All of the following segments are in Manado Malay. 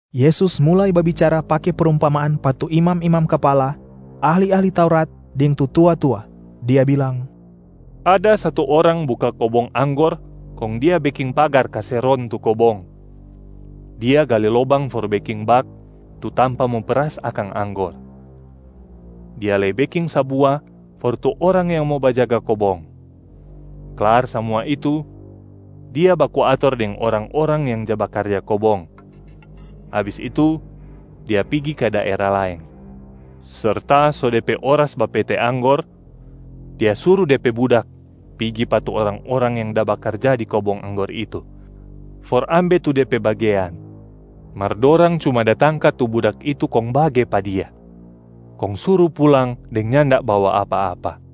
Yesus mulai babicara pake prumpamaan pa tu imam-imam kapala, ahli-ahli Taurat deng tu tua-tua. Dia bilang, “Ada satu orang buka kobong anggor kong dia beking pagar kase ron tu kobong. Dia gale lobang for beking bak, tu tampa mo peras akang anggor. Dia lei beking sabua for tu orang yang mo bajaga kobong. Klar samua itu, dia baku ator deng orang-orang yang ja bakarja kobong. Abis itu, dia pigi ka daera laeng. Serta so de pe oras bapete anggor, dia suru de pe budak pigi pa tu orang-orang yang da bakarja di kobong anggor itu for ambe tu de pe bagean. Mar dorang cuma da tangka tu budak itu kong bage pa dia, kong suru pulang deng nyanda bawa apa-apa.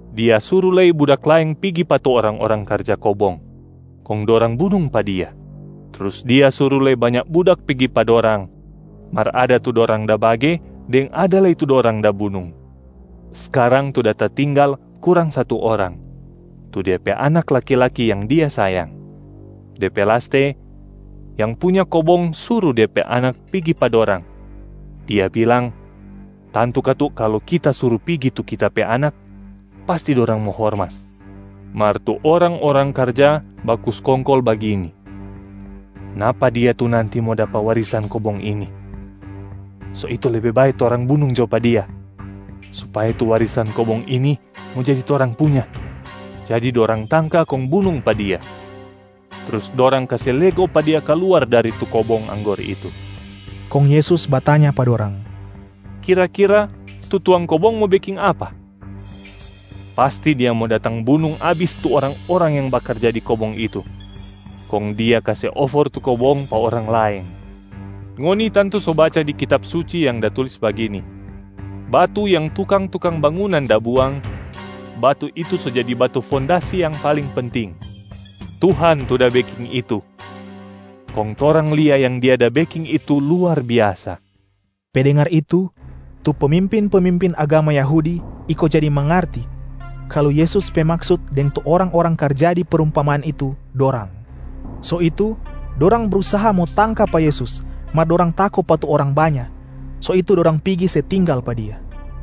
Dia suru lei budak laeng pigi pa tu orang-orang karja kobong, kong dorang bunung pa dia. Trus dia suru lei banya budak pigi pa dorang, mar ada tu dorang da bage deng ada lei tu dorang da bunung. Skarang tu da tatinggal kurang satu orang, tu dia pe anak laki-laki yang dia sayang. De pe laste, yang punya kobong suru de pe anak pigi pa dorang, dia bilang, ‘Tantu katu kalu kita suru pigi tu kita pe anak, pasti dorang mo hormat.’ Mar tu orang-orang karja baku skongkol bagini, ‘Napa dia tu nanti mo dapa warisan kobong ini. So itu lebe bae torang bunung jo pa dia, supaya tu warisan kobong ini mo jadi torang punya.’ Jadi dorang tangka kong bunung pa dia, trus dorang kase lego pa dia kaluar dari tu kobong anggor itu.” Kong Yesus batanya pa dorang, “Kira-kira tu tuang kobong mo beking apa? Pasti dia mo datang bunung abis tu orang-orang yang bakarja di kobong itu, kong dia kase ofor tu kobong pa orang laeng. Ngoni tantu so baca di Kitab Suci yang da tulis bagini, ‘Batu yang tukang-tukang bangunan da buang, batu itu so jadi batu fondasi yang paling penting. Tuhan tu da beking itu, kong torang lia yang Dia da beking itu luar biasa.’” Pe dengar itu, tu pemimpin-pemimpin agama Yahudi iko jadi mangarti kalu Yesus pe maksut deng tu orang-orang karja di prumpamaan itu dorang. So itu dorang brusaha mo tangka pa Yesus, mar dorang tako pa tu orang banya, so itu dorang pigi se tinggal pa Dia.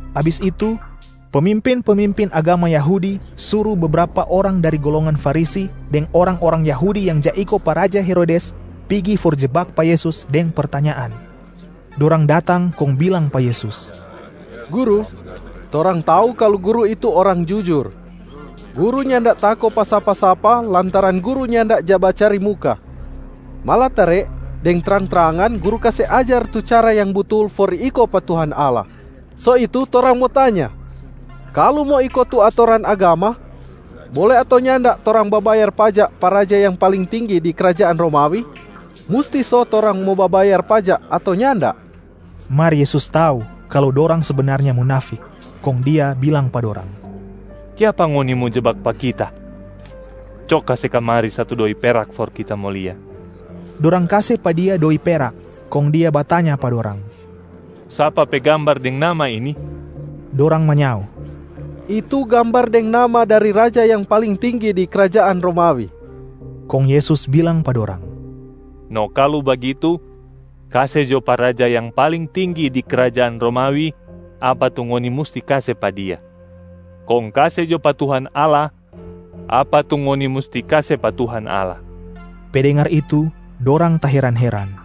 Abis itu, pemimpin-pemimpin agama Yahudi suru bebrapa orang dari golongan Farisi deng orang-orang Yahudi yang ja iko pa raja Herodes pigi for jebak pa Yesus deng pertanyaan. Dorang datang kong bilang pa Yesus, “Guru, torang tau kalu Guru itu orang jujur. Guru nyanda tako pa sapa-sapa lantaran Guru nyanda ja bacari muka, malatare deng trang-trangan Guru kase ajar tu cara yang butul for iko pa Tuhan Allah. So itu torang mo tanya, kalu mo iko tu atoran agama, bole ato nyanda torang babayar pajak pa raja yang paling tinggi di krajaan Romawi? Musti so torang mo babayar pajak ato nyanda?” Mar Yesus tau kalu dorang sebenarnya munafik. Kong Dia bilang pa dorang, “Kiapa ngoni mo jebak pa Kita? Co kase kamari satu doi perak for Kita mo lia!” Dorang kase pa Dia doi perak, kong Dia batanya pa dorang, “Sapa pe gambar deng nama ini?” Dorang manyao, “Itu gambar deng nama dari raja yang paling tinggi di krajaan Romawi.” Kong Yesus bilang pa dorang, “No kalu bagitu, kase jo pa raja yang paling tinggi di krajaan Romawi apa tu ngoni musti kase pa dia, kong kase jo pa Tuhan Allah apa tu ngoni musti kase pa Tuhan Allah!” Pe dengar itu, dorang taheran-heran.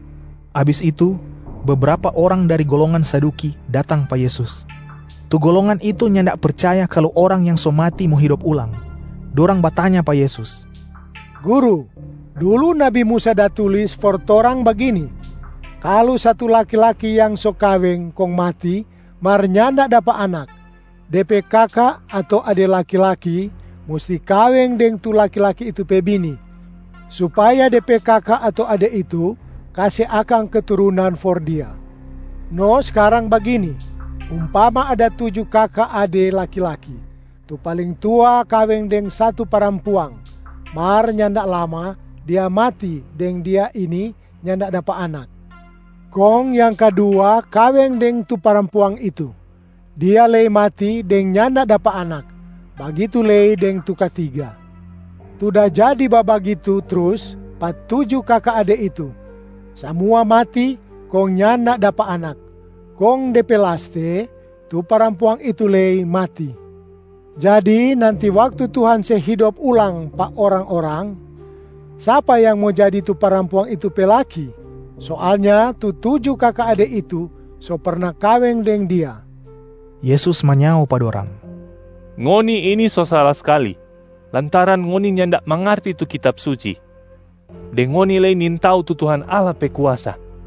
Abis itu, bebrapa orang dari golongan Saduki datang pa Yesus. Tu golongan itu nyanda percaya kalu orang yang so mati mo hidop ulang. Dorang batanya pa Yesus, “Guru, dulu nabi Musa da tulis for torang bagini: kalu satu laki-laki yang so kaweng kong mati mar nyanda dapa anak, de pe kaka ato ade laki-laki musti kaweng deng tu laki-laki itu pe bini, supaya de pe kaka ato ade itu kase akang keturunan for dia. No skarang bagini, umpama ada tuju kaka ade laki-laki. Tu paling tua kaweng deng satu parampuang, mar nyanda lama dia mati deng dia ini nyanda dapa anak. Kong yang kadua kaweng deng tu parampuang itu. Dia lei mati deng nyanda dapa anak. Bagitu lei deng tu katiga. Tu da jadi babagitu trus pa tu tuju kaka ade itu, samua mati kong nyanda dapa anak. Kong de pe laste, tu parampuang itu lei mati. Jadi nanti waktu Tuhan se hidop ulang pa orang-orang, sapa yang mo jadi tu parampuang itu pe laki? Soalnya tu tuju kaka ade itu so perna kaweng deng dia.” Yesus manyao pa dorang, “Ngoni ini so sala skali lantaran ngoni nyanda mangarti tu Kitab Suci, deng ngoni lei nintau tu Tuhan Allah pe kuasa.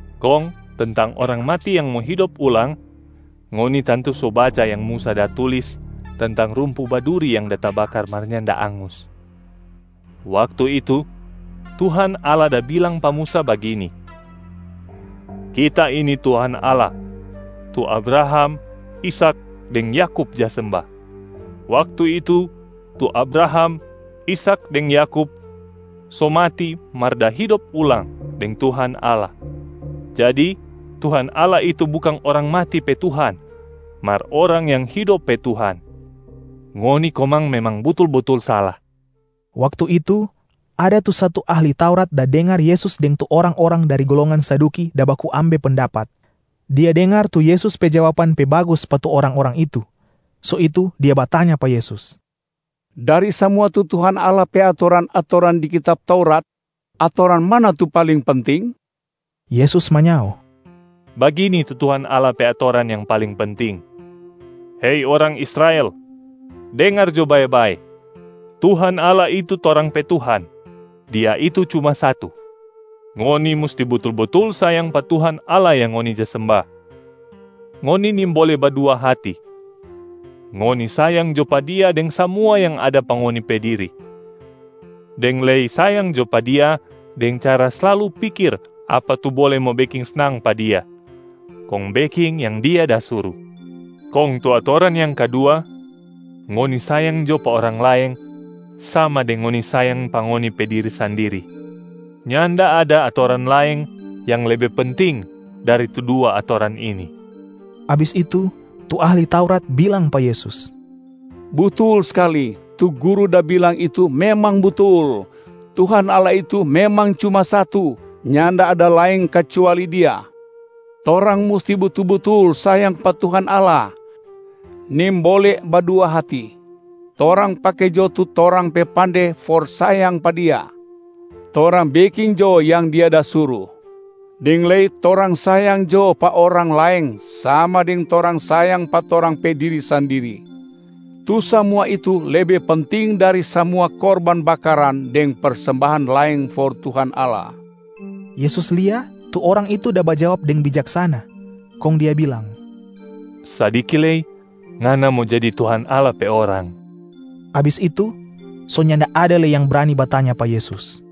Kong tentang orang mati yang mo hidop ulang, ngoni tantu so baca yang Musa da tulis tentang rumpu baduri yang da tabakar mar nyanda angus. Waktu itu, Tuhan Allah da bilang pa Musa bagini, ‘Kita ini Tuhan Allah, tu Abraham, Ishak deng Yakub ja semba.’ Waktu itu, tu Abraham, Ishak deng Yakub so mati mar da hidop ulang deng Tuhan Allah. Jadi Tuhan Allah itu bukang orang mati pe Tuhan mar orang yang hidop pe Tuhan. Ngoni komang memang butul-butul sala.” Waktu itu, ada tu satu ahli Taurat da dengar Yesus deng tu orang-orang dari golongan Saduki da baku ambe pendapat. Dia dengar tu Yesus pe jawaban pe bagus pa tu orang-orang itu. So itu dia batanya pa Yesus, “Dari samua tu Tuhan Allah pe atoran-atoran di Kitab Taurat, atoran mana tu paling penting?” Yesus manyao, “Bagini tu Tuhan Allah pe atoran yang paling penting: ‘Hei orang Israel, dengar jo bae-bae. Tuhan Allah itu torang pe Tuhan, Dia itu cuma satu. Ngoni musti butul-butul sayang pa Tuhan Allah yang ngoni ja semba, ngoni nimbole badua hati. Ngoni sayang jo pa Dia deng samua yang ada pa ngoni pe diri, deng lei sayang jo pa Dia deng cara slalu pikir apa tu bole mo beking snang pa Dia, kong beking yang Dia da suru.’ Kong tu atoran yang kadua, ‘Ngoni sayang jo pa orang laeng sama deng ngoni sayang pa ngoni pe diri sandiri.’ Nyanda ada atoran laeng yang lebe penting dari tu dua atoran ini.” Abis itu, tu ahli Taurat bilang pa Yesus, “Butul skali, tu Guru da bilang itu memang butul. Tuhan Allah itu memang cuma satu, nyanda ada laeng kacuali Dia. Torang musti butul-butul sayang pa Tuhan Allah, nimbole badua hati. Torang pake jo tu torang pe pande for sayang pa Dia, torang beking jo yang Dia da suru, deng lei torang sayang jo pa orang laeng sama deng torang sayang pa torang pe diri sandiri. Tu samua itu lebe penting dari samua korban bakaran deng persembahan laeng for Tuhan Allah.” Yesus lia tu orang itu da bajawab deng bijaksana, kong Dia bilang, “Sadiki lei ngana mo jadi Tuhan Allah pe orang.” Abis itu, so nyanda ada lei yang brani batanya pa Yesus.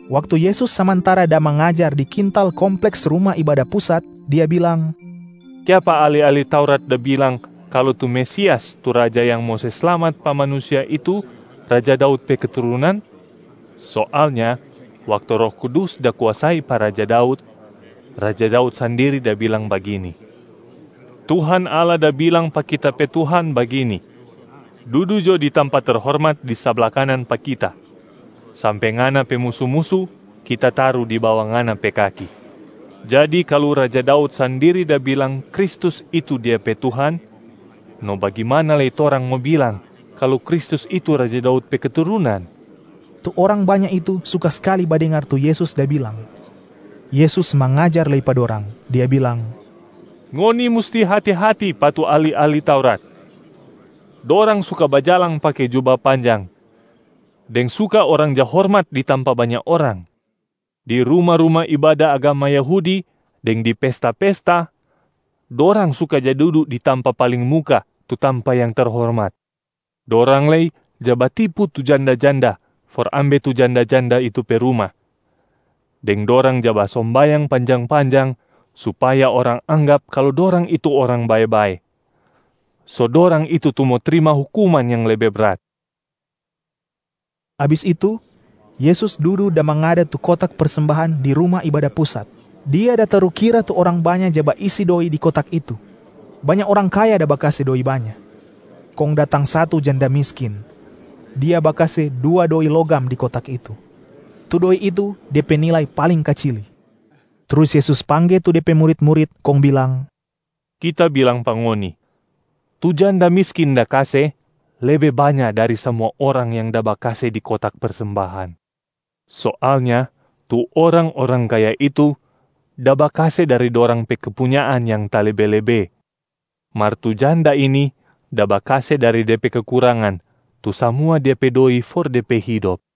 Waktu Yesus samantara da mangajar di kintal kompleks Ruma Ibada Pusat, Dia bilang, “Kiapa ahli-ahli Taurat da bilang kalu tu Mesias tu Raja yang mo se slamat pa manusia itu raja Daud pe keturunan? Soalnya waktu Roh Kudus da kuasai pa raja Daud, raja Daud sandiri da bilang bagini, Tuhan Allah da bilang pa kita pe Tuhan bagini, ‘Dudu jo di tampa terhormat di sabla kanan pa Kita, sampe Ngana pe musu-musu Kita taru di bawa Ngana pe kaki.’ Jadi kalu raja Daud sandiri da bilang Kristus itu dia pe Tuhan, no bagimana lei torang mo bilang kalu Kristus itu raja Daud pe keturunan?” Tu orang banya itu suka skali badengar tu Yesus da bilang. Yesus mangajar lei pa dorang, Dia bilang, “Ngoni musti hati-hati pa tu ahli-ahli Taurat! Dorang suka bajalang pake juba panjang deng suka orang ja hormat di tampa banya orang. Di ruma-ruma ibada agama Yahudi deng di pesta-pesta, dorang suka ja dudu di tampa paling muka tu tampa yang terhormat. Dorang lei ja batipu tu janda-janda for ambe tu janda-janda itu pe ruma, deng dorang ja basombayang panjang-panjang supaya orang anggap kalu dorang itu orang bae-bae. So dorang itu tu mo trima hukuman yang lebe brat.” Abis itu, Yesus dudu da mangada tu kotak persembahan di Ruma Ibada Pusat, Dia da tarukira tu orang banya ja baisi doi di kotak itu. Banya orang kaya da bakase doi banya. Kong datang satu janda miskin. Dia bakase dua doi logam di kotak itu, tu doi itu de pe nilai paling kacili. Trus Yesus pangge tu De pe murit-murit kong bilang, “Kita bilang pa ngoni, tu janda miskin da kase lebe banya dari samua orang yang da bakase di kotak persembahan. Soalnya tu orang-orang kaya itu da bakase dari dorang pe kepunyaan yang talebe-lebe, mar tu janda ini da bakase dari de pe kekurangan tu samua dia pe doi for de pe hidop.”